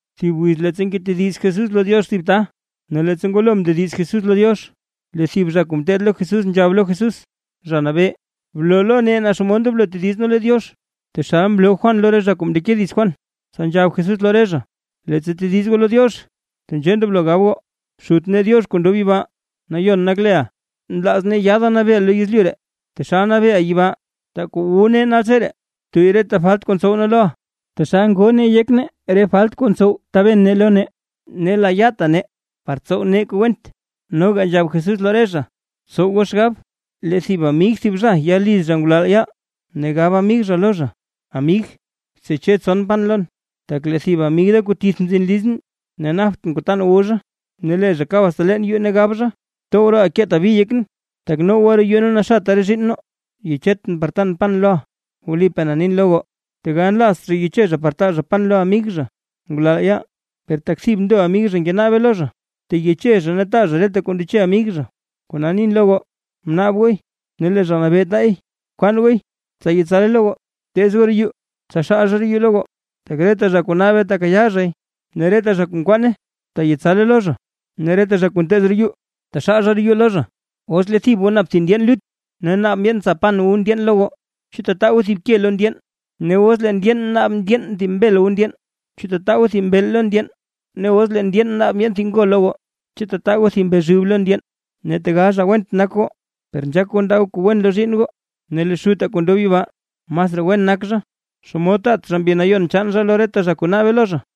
Thib wiz leettsa ngetediz Jesús lo Diox thib ta. Ne leettsa ngwalo mndediz Jesús lo Diox, lee thib zha kuu ngeteed lo Jesús nzhab lo Jesús: ―Zha Nabee, bloo lo nee naa xomod ndoblo tediz nee lo Diox, taxal mloo Juan lo re zha kuu mndeke dits Juan. Tsa nzhab Jesús lo re zha: ―Leettsa tediz goo lo Diox tenzhee ndoblo gab goo: Xut nee Diox kuu ndob yibaa, nayon nak leʼa. Nlaaz nee yaada nabeeʼa lo yezlyu ree, taxal nabeeʼa yibaa. Taa kuu wu nee naltseree. Btuyy reta falt kuu ntsow nee loʼa, taxal ngoo nee yek nee re falt kuu ntsow taben nee lo nee. Ne layaata nee par tsow nee kuu went. Noga nzhab Jesús lo re zha: ―Tsow goo xgab, lee thib amig thib zha ya liz zha ngulal yaal, ne gab amig zha lo zha: “Amig, tseche tson pan lon, tak lee thib amig da kuu tith mzin lizʼn, ne naptʼn kuu tan wu zha”. Ne lee zha kab asta leen yuu ne gab zha: “Tow rooʼa keeta bi yekʼn, tak noowa roo yuu ne naxata re zhiinn na, yechetʼn par tan pan loʼa”. Wlipaa na nin lo goo, tegal nlaazt zha yeche zha par taa zha pan lo amig zha ngulal yaal, per tak thib ndo amig zha ngenaabe lo zha, teyeche zha ne taa zha reta kuu ndeche amig zha. Kona nin lo goo; bnaab gooy, ne lee Zha Nabee taay; bkwaan gooy tsa yetsale lo goo; Bteez goo roo yuu, tsa xaal zha roo yuu lo goo. Tak reta zha kuu naabe tekayaa zhay; ne reta zha kuu nkwaane, teyetsale lo zha; ne reta zha kuu nteez roo yuu, taxaal zha roo yuu lo zha. ’Os lee thib goo nap thib ndyeen lut, ne naab ndyeen tsa pan wu ndyeen lo goo, ¿chu tataa goo thib ke lo ndyeen? O os lee ndyeen naab ndyeen thib mbel wu ndyeen, ¿chu tataa goo thib mbeel lo ndyeen? Ne os lee ndyeen naab thib ngo lo goo, ¿chu tataa goo thib mbezhub lo ndyeen? Ne tegal zha went nak goo, per nzhaak goo ndaa goo kuu wen lo zhiinn goo, ne lee Xutaa kuu ndob yibaa, masraa wen nak zha, ¡xomod taat zha Mbi Nayon chaan zha lo reta zha kuu naabe lo zha!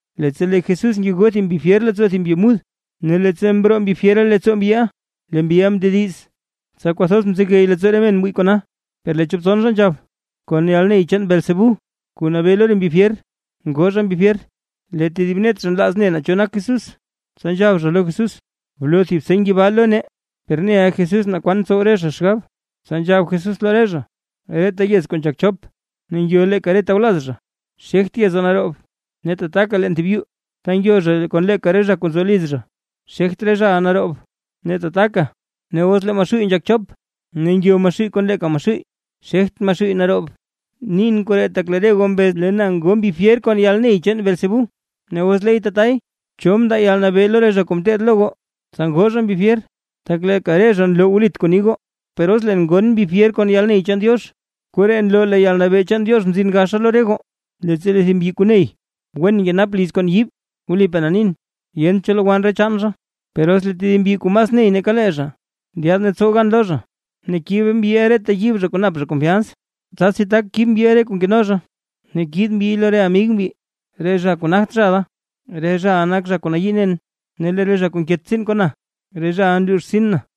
Leettsa lee Jesús ngegoo thib mbi fyer leettsoo thib mbyi mud; ne leettsa mroo mbi fyera leettsoo mbyiʼa, lee mbyiʼa mndediz. Tsa kwathoz mzegey leettsoo re men mwii kona. Per lee chop tson zha nzhab: ―Kon yalney chaan Beelzebú, kuu nabee lo re mbi fyer ngoo zha re mbi fyer. Lee tedib net zha nlaaz ne naa cho nak Jesús, tsa nzhab zha lo Jesús: ―Bloo thib seny yibaa lo nee. Per neʼa Jesús naa kwan ntsow re zha xgab, tsa nzhab Jesús lo re zha: ―Reta yez kuu nzhak chop, ne ngyo zha leeka re tawlaz zha, xegt yeza naroob, ne tataka leen thib yuu ta ngyo zha kon leeka re zha kuu nzo liz zha, xegt re zhaʼa naroob. Ne tataka, os lee Maxuuy nzhak chop, ne ngyo Maxuuy kon leeka Maxuuy, xegt Maxuuy naroob. Nin koree tak lee re goo mbez lee na ngo mbi fyer kon yalney chaan Beelzebú; Ne os leey tatay, ¿cho mndaa yalnabee lo re zha kuu ngeteed lo goo, tsa ngoo zha mbi fyer? Tak leeka re zha nloo wlit kuu ni goo. Per os leen ngon mbi fyer kon yalney chaan Diox, koree nloo lee yalnabee chaan Diox mzina lo re goo. ’Leettsa lee thib mbyi kuu ney wen nkenap liz kon yiib, wlipaa na nin, yent cho lowann re chaan zha. Per os lee tedib mbyi kuu mas ney nake lee zha, ndyaad ne tsow gan lo zha, ne kib mbyiʼa reta yiib zha kuu nap zha konfyans, tsasi tak kib mbyiʼa re kuu nkeno zha ne kiid mbyiy lo re amig mbyi. ’Re zha kuu nagt zha da, re zhaʼa nak zha kuu nayii nen; ne lee re zha kuu nket tsiin kon na, re zhaʼa nluux rtsin na.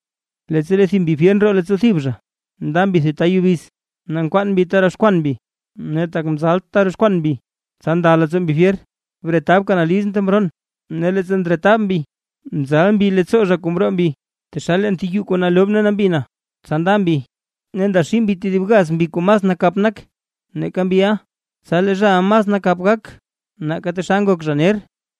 ’Leettsa lee thib mbi fyer ndroo leettsoo thib zha, nda mbi thib ta yubiz, ne nkwaan mbi ta roxkwan mbi; ne tak mzalt ta roxkwan mbi, tsa nda leettsoo mbi fyer: “Bretabka na lizʼn, ta mroon”. Ne leettsa ndretab mbi, nzal mbi leettsoo zha kuu mroo mbi, taxal leen thib yuu kuu nalob ne nambi na. Tsa nda mbi ne ndaxii mbi tedib gaz mbi kuu mas nakap nak nake mbiʼa. Tsa lee zhaʼa mas nakap gak nake taxal ngok zha ner.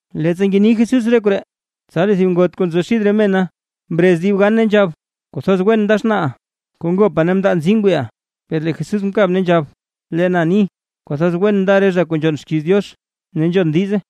Leettsa ngeni Jesús re koree, tsa lee thib ngot kuu nzo xid re mena mrez dib gan ne nzhab: ―¡Kwathoz wen nda xnaaʼa, kuu ngopa ne mndaa nzii ngwiiʼa! Per lee Jesús mkab, ne nzhab: ―Lee na ni: ¡Kwathoz wen nda re zha kuu nzhon xkiiz Diox, ne nzhon dize!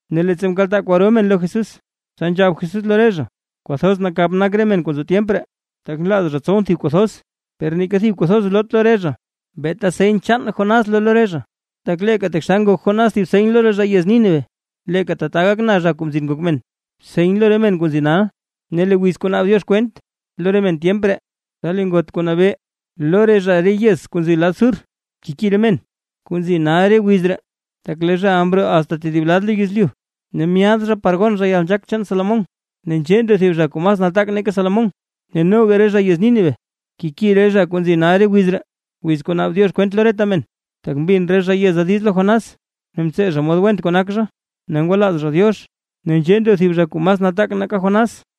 Ne leettsa mkaltaa kwaro men lo Jesús, tsa nzhab Jesús lo re zha: ―Kwathoz nakap nak re men kuu nzo tyemp ree, tak nlaaz zha tsowʼn thib kuu thoz, per neeka thib kuu thoz loot lo re zha, beeta seny chaan Jonás loo lo re zha. Tak leeka taxal ngok Jonás thib seny lo re zha yez Nínive, leeka tata gak na, Kuu Mzin Ngok Men, seny lo re men kuu nzi nal. Ne lee wiz kuu naab Diox kwent lo re men tyemp ree, tsa lee ngot kuu nabee lo re zha re yez kuu nzi lad Sur, keki re men kuu nzi nal re wiz ree, tak lee zhaʼa mroo asta tedib lad lo yezlyu ne myaad zha par gon zha yalnzhaak chaan Salomón. Ne nzhee ndo thib zha kuu mas nataak nake Salomón. Ne noga re zha yez Nínive keki re zha kuu nzi nal re wiz ree, wiz kuu naab Diox kwent lo reta men, tak mbin re zha yeza diiz lo Jonás, ne mtsee zha mod went kuu nak zha ne ngwalaaz zha Diox. Ne nzhee ndo thib zha kuu mas nataak nake Jonás.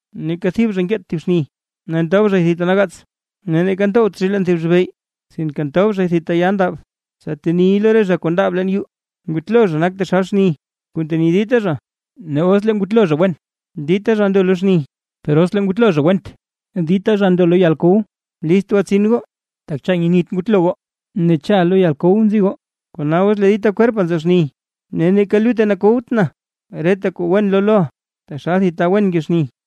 ’Neeka thib zha nkeet thib xni, ne ntob zhay thib ta nagaats, ne neeka ntowt zhay leen thib zhibey, sinke ntob zhay thib ta ya ndab, tsa teniy lo re zha kuu ndaab leen yuu. Ngutlo zha nak taxal xni kuu nteni dita zha; ne os lee ngutlo zha wen, dita zha ndo lo xni; per os lee ngutlo zha went, dita zha ndo lo yalkow. List gwatsin goo, tak cha nyenit ngutlo goo ne cha lo yalkow nzi goo. Kona os lee dita kwerpa nzo xni, ne neeka lutte nakowt na, reta kuu wen loo loʼa, taxal thib ta wen nke xni.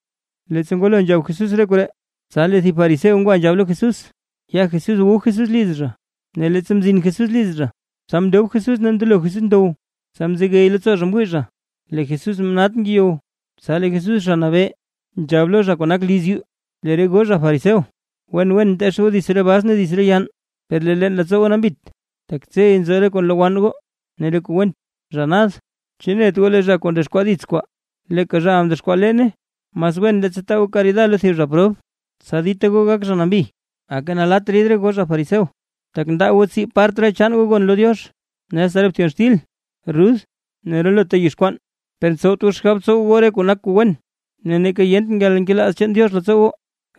Leettsa ngwalo nzhab Jesús re koree, tsa lee thib fariseo ngwa nzhab lo Jesús, ya Jesús wu Jesús liz zha. Ne leettsa mzin Jesús liz zha, tsa mndob Jesús ne mndelo Jesús ndow. Tsa mzegey leettsoo zha mwii zha, lee Jesús mnat ngeyow. Tsa lee Jesús Zha Nabee, nzhab lo zha kuu nak liz yuu: ―Lee re goo zha fariseo, wen wen nteech goo dits re bas ne dits re yann, per lee leettsoo goo nambit, tak tsey nzo re kuu nlowann goo ne re kuu went. ¡Zha nad! ¿Chu net goo leeka zha kuu mdexkwaa dits kwaa leeka zhaʼa mdexkwaa leene? Mas wen leettsa taa goo karida lo thib zha prob, tsa dita goo gak zha nambi. ’¡Aka nalatt rid goo zha fariseo! Tak ndaa goo tsii part re chaan goo gon lo Diox, ne asta re bthyon xtil, rud ne relota yizh kwaan, per ntsowt goo xgab tsow goo re kuu nak kuu wen, ne neeka yent yalnkelaaz chaan Diox leettsoo goo.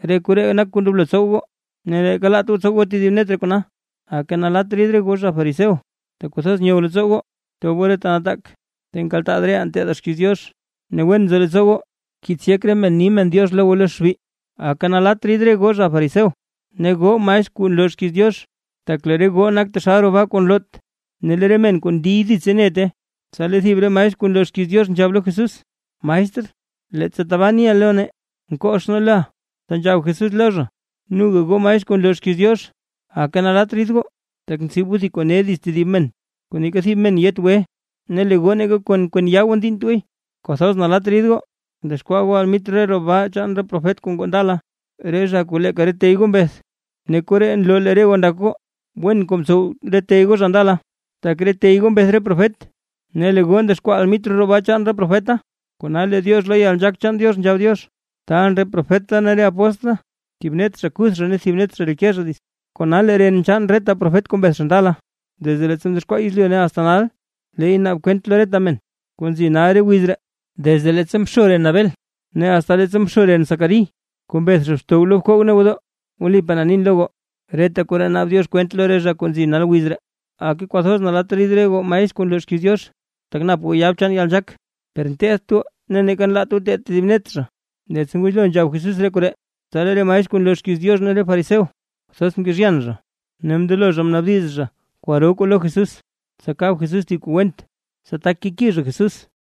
Re koree nak kuu ndoblo tsow goo, ne neeka laat goo tsow goo tedib net re kona. ’¡Aka nalatt rid goo zha fariseo! Tak kwathoz nyow leettsoo goo tob goo re ta nataak, ta nkaltaa reʼaa nteedaa xkiiz Diox, ne wen nzo leettsoo goo nkiits yek re men ni men “diox” lo goo lo xbi. ’¡Aka nalatt rid re goo zha fariseo ne goo maestr kuu nloo xkiiz Diox! Tak lee re goo nak taxal roo baa kuu nloot, ne lee re men kuu ndiy ditse nete. Tsa lee thib re maestr kuu nloo xkiiz Diox nzhab lo Jesús: ―¡Maestr, leettsa tabaa niʼa lo nee, nkox nee loʼa! Tsa nzhab Jesús lo zha: ―¡Noga goo maestr kuu nloo xkiiz Diox, aka nalatt rid goo! Tak ntsib goo kuu ne dits tedib men, kuu neeka thib men yet gwe. Ne lee goo neeka kon kwen yaa goo ndiinnt gooy. ’¡Kwathoz nalatt rid goo! Tak ndexkwaa goo almitr re roo baa chaan re profet kuu ngoo ndala, re zha kuu leeka re tey goo mbeth. Ne koree nloo lee re goo ndak goo wen kuu mtsow re tey goo zha ndala, tak re tey goo mbeth re profet, ne lee re goo ndexkwaa almitr roo baa chaan re profeta. ’Kona lee Diox lo yalnzhaak chaan Diox nzhab Diox: “Taalʼn re profet da ne re apóstl da, ne thib net zha kuth zha ne lee tedib net zha reke zha dits”. Kona lee ren chaan reta profet kuu mbeth zha ndala, desde leettsa mdexkwaa yezlyu ne asta nal, leey naab kwent lo reta men kuu nal re wiz ree, desde leettsa mxo ren Abel ne asta leettsa mxo ren Zacarí kuu mbeth zha xtow bkoog ne gwodoo. Wlipaa na nin lo goo, reta koree naab Diox kwent lo re zha kuu nzi nal wiz ree. ’¡Aka kwathoz nalatt rid goo maestr kuu nloo xkiiz Diox! Tak nap goo yab chaan yalnzhaak, per nteedt goo ne neeka nlaat goo teed tedib net zha. Leettsa ngwalo nzhab Jesús re koree; tsa lee re maestr kuu nloo xkiiz Diox ne re fariseo kwathoz mkezhyan zha, ne mndelo re zha mnaabdiz zha kwaro kwaa lo Jesús, tsa kab Jesús thib kuu went, tsa tak keki zha Jesús.